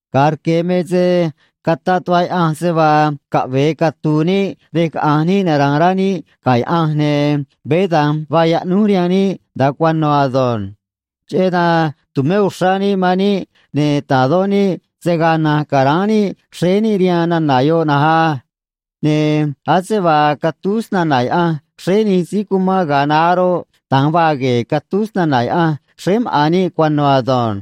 Ga̱a rque̱ me se cataꞌ tuꞌva Yaꞌanj se vaa caꞌve̱e catu̱u̱ níꞌ rej caꞌa̱nj níꞌ nara̱a̱n rá níꞌ ga̱ Yaꞌanj, ne̱ veé da̱nj vaa yaꞌnúj rihaan níꞌ nda̱a cuano̱ ado̱nj. Cheꞌé dan tu̱mé uxrá níꞌ man níꞌ, ne̱ ta̱dó níꞌ se̱ gaa na̱nj ca̱ráán níꞌ xréé níꞌ rihaan nana̱ yoꞌ na̱nj á. Ne̱ ase vaa catúj snana̱ Yaꞌanj xréé nij síí cumán ga̱a naá roꞌ, da̱nj vaa gue̱e̱ catúj snana̱ Yaꞌanj xréé maꞌa̱n níꞌ cuano̱ ado̱nj.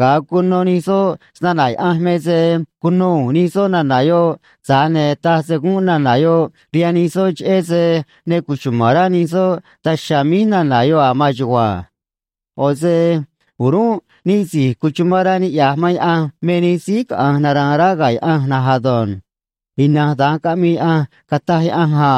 Ga̱a cuno nij soꞌ snana̱ Yaꞌanj me se cuno u̱u̱n nij soꞌ nana̱ yoꞌ, tza̱j ne̱ taj se gúnꞌ nana̱ yoꞌ rihaan nij soꞌ cheꞌé se ne cuchuma̱n rá nij soꞌ daj chiha̱a̱ míj nana̱ yoꞌ a̱ maan chugua̱nj. ꞌO̱ se o̱rúnꞌ níꞌ si̱j cuchumán rá niꞌya̱j man Yaꞌanj me nij síí caꞌa̱nj nara̱a̱n rá ga̱ Yaꞌanj na̱nj ado̱nj. Ina̱nj da̱nj caꞌmii Yaꞌanj, cataj Yaꞌanj a: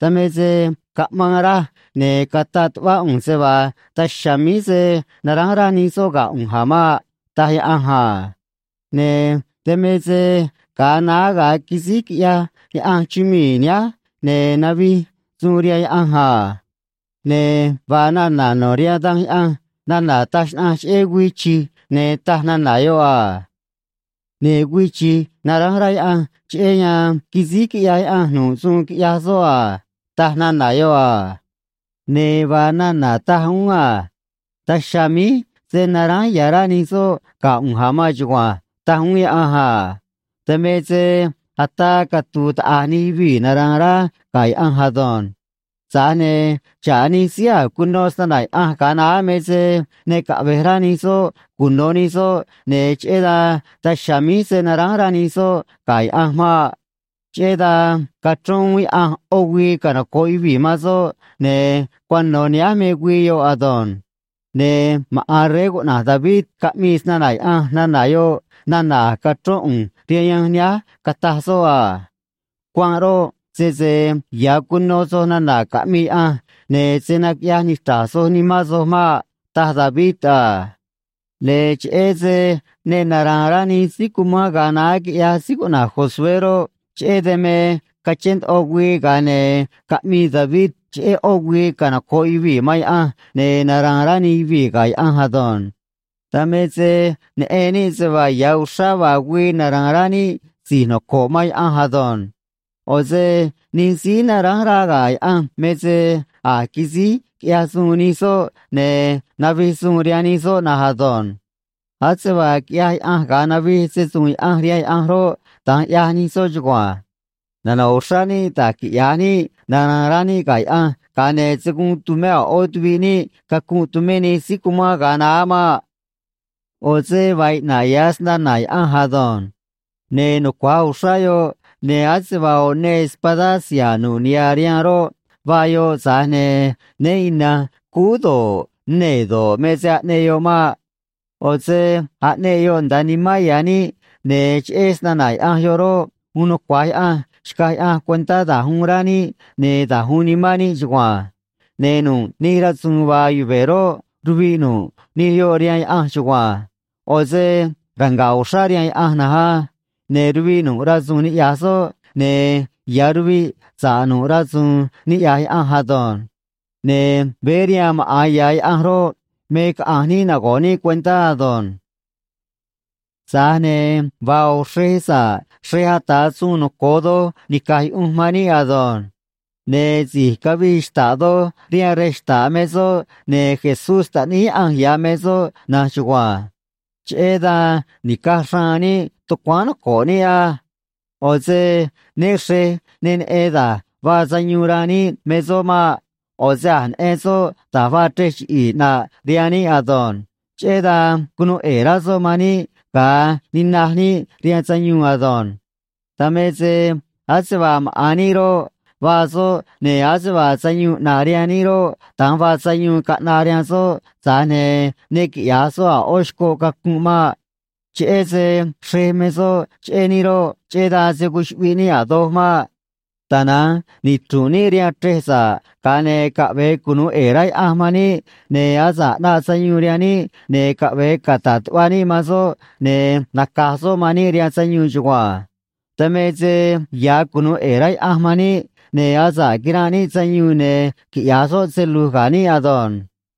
Dan me se caꞌmaan raj, ne̱ cataꞌ tuꞌvá ꞌu̱nj se vaa daj chiha̱a̱ míj se̱ naránj rá nij soꞌ ga̱ ꞌu̱nj a̱ maꞌ, taj Yaꞌanj a. Ne̱ dan me se ga̱a naá ga̱a quisíj quiꞌyaj Yaꞌanj chumii̱ nihánj, ne̱ navij suun rihaan Yaꞌanj a. Ne̱ vaa nana̱ no̱ rihaan Danj Yaꞌanj nana̱ taj xnaꞌanj cheꞌé güii chi̱j, ne̱ taj nana̱ yoꞌ a: Ne̱ güii chi̱j naránj rá Yaꞌanj cheꞌé yan quisíj quiꞌyaj Yaꞌanj nu̱ꞌ suun quiꞌyaj soꞌ a, taj nana̱ yoꞌ a. Ne̱ vaa nana̱ taj uún a: Daj chiha̱a̱ míj se̱ naránj ya̱ rá nij soꞌ ga̱ ꞌu̱nj a̱ maan chugua̱nj, taj uún Yaꞌanj a. Dan me se ataa catu̱u̱ taꞌa̱j nij yuvii̱ nara̱a̱n rá ga̱ Yaꞌanj ado̱nj. Tza̱j ne̱ xa̱ꞌ nij síí a̱j cuno snana̱ Yaꞌanj ga̱a naá me se ne caꞌve̱j rá nij soꞌ cuno̱ nij soꞌ, ne̱ cheꞌé dan daj chiha̱a̱ míj se̱ naránj rá nij soꞌ ga̱ Yaꞌanj maꞌ. Cheꞌé dan cachrón uún Yaꞌanj ꞌó güii canoco̱ꞌ yuvii̱ man soꞌ, ne̱ cuano̱ nihánj me güii yoꞌ ado̱nj. Ne̱ maꞌa̱n rey cuꞌna̱j David caꞌmii snana̱ Yaꞌanj nana̱ yoꞌ nana̱ a̱j cachrón ꞌu̱nj rihaan yanj nihánj, cataj soꞌ a: Cuanꞌ roꞌ, sese ya̱ cuno soj nana̱ caꞌmii Yaꞌanj, ne̱ se̱ naquiꞌyaj nichra̱j soj nimán soj maꞌ, taj David a. Ne̱ cheꞌé se ne nara̱a̱n rá nij síí cumán ga̱a naá, quiꞌyaj síí cuꞌna̱j Josué roꞌ, cheꞌé dan me cachén ndoꞌo güii, ga̱a ne̱ caꞌmii David cheꞌé ꞌó güii canoco̱ꞌ yuvii̱ man Yaꞌanj, ne̱ nara̱a̱n rá nij yuvii̱ ga̱ Yaꞌanj ado̱nj. Dan me se neꞌen níꞌ se vaa ya̱ uxrá vaa güii nara̱a̱n rá níꞌ si̱j noco̱ꞌ man Yaꞌanj ado̱nj. ꞌO̱ se nij síí naránj rá ga̱ Yaꞌanj me se a̱j quisíj quiꞌyaj suun nij soꞌ, ne̱ navij suun rihaan nij soꞌ na̱nj ado̱nj. Ase vaa quiꞌyaj Yaꞌanj ga̱a navij se‑su̱u̱n Yaꞌanj rihaan Yaꞌanj roꞌ, da̱nj ꞌyaj nij soꞌ chugua̱nj. Nano̱ꞌ uxrá níꞌ da̱j quiꞌya̱j níꞌ nara̱a̱n rá níꞌ ga̱ Yaꞌanj, ga̱a ne̱ se̱ guun tu̱mé a̱ ꞌó tuviꞌ níꞌ cacunꞌ tumé nij síí cumán ga̱a naá maꞌ. ꞌO̱ se vaa iꞌna̱ꞌ ya̱ snana̱ Yaꞌanj ado̱nj. Ne̱ nucua̱j uxrá yoꞌ, ne̱ ase vaa ꞌo̱ neê espadá siha̱a̱ nu̱ꞌ niha̱ rihaan roꞌ, vaa yoꞌ, tza̱j ne̱ né ina̱nj cúú do̱ꞌ, nee̱ do̱ꞌ, me se aꞌneꞌ yoꞌ maꞌ. ꞌO̱ se aꞌneꞌ yoꞌ nda̱a nimán ya̱ níꞌ, ne̱ cheꞌé snana̱ Yaꞌanj yoꞌ roꞌ, uun nucua̱j Yaꞌanj xcaj Yaꞌanj cuentá da̱j uun rá níꞌ ne̱ da̱j uun nimán níꞌ chugua̱nj. Ne̱ nu̱ꞌ nij rasu̱u̱n vaa yuve̱ roꞌ, ruviꞌ nu̱ꞌ nij yoꞌ rihaan Yaꞌanj chugua̱nj. ꞌO̱ se ranga̱ꞌ uxrá rihaan Yaꞌanj na̱nj á. Ne̱ ruviꞌ nu̱ꞌ rasu̱u̱n niꞌya̱j soꞌ, ne̱ ya̱ ruviꞌ sa̱ꞌ nu̱ꞌ rasu̱u̱n niꞌya̱j Yaꞌanj ado̱nj. Ne̱ veé rihaan maꞌa̱n ya̱ Yaꞌanj roꞌ, me caꞌa̱nj níꞌ nago̱ꞌ níꞌ cuentá ado̱nj. Tza̱j ne̱ vaa ꞌo̱ xrej sa̱ꞌ xrej ata̱ suun noco̱o doj nica̱j yuꞌunj man níꞌ ado̱nj. Ne̱ si̱j cavii xta̱ꞌ doj rihaan rej xta̱ꞌ me soꞌ, ne̱ Jesús Taꞌníí Yaꞌanj ya̱ me soꞌ na̱nj chugua̱nj. Cheꞌé dan ni̱caj xraan níꞌ tucuáán noco̱ꞌ níꞌ á. ꞌO̱ se né xre̱j ne neꞌen da̱j vaa sayuun ranꞌ níꞌ me soꞌ maꞌ. ꞌO̱ se a̱j neꞌen soꞌ da̱j vaa chrej chiꞌi̱i̱ ꞌnaꞌ rihaan níꞌ ado̱nj. Cheꞌé dan cunuu ꞌe̱e̱ rá soꞌ man níꞌ ga̱a nina̱j níꞌ rihaan sayuun ado̱nj. Dan me se ase vaa maꞌa̱n níꞌ roꞌ, vaa soꞌ, ne̱ ase vaa sayuun ꞌnaꞌ rihaan níꞌ roꞌ, da̱nj vaa sayuun caꞌnaꞌ rihaan soꞌ, tza̱j ne̱ ne quiꞌya̱j soꞌ a̱ ꞌó xcoꞌ cacunꞌ maꞌ. Cheꞌé se xrej me soꞌ cheꞌé níꞌ roꞌ, cheꞌé dan se̱ cuchuꞌviꞌ níꞌ a̱ doj maꞌ. Tana̱nj nichru̱nꞌ níꞌ rihaan chrej sa̱ꞌ, ga̱a ne̱ caꞌve̱e cunu̱u ꞌe̱e̱ rá Yaꞌanj man níꞌ, ne̱ asa̱ꞌ ꞌnaꞌ sayuun rihaan níꞌ, ne̱ caꞌve̱e cata̱ꞌ tuꞌva níꞌ man soꞌ, ne̱ naca̱j soꞌ man níꞌ rihaan sayuun chugua̱nj. Dan me se ya̱ cunu̱u ꞌe̱e̱ rá Yaꞌanj man níꞌ, ne̱ asa̱ꞌ quiranꞌ níꞌ sayuun, ne̱ quiꞌya̱j soꞌ se lu̱j ga̱ níꞌ ado̱nj.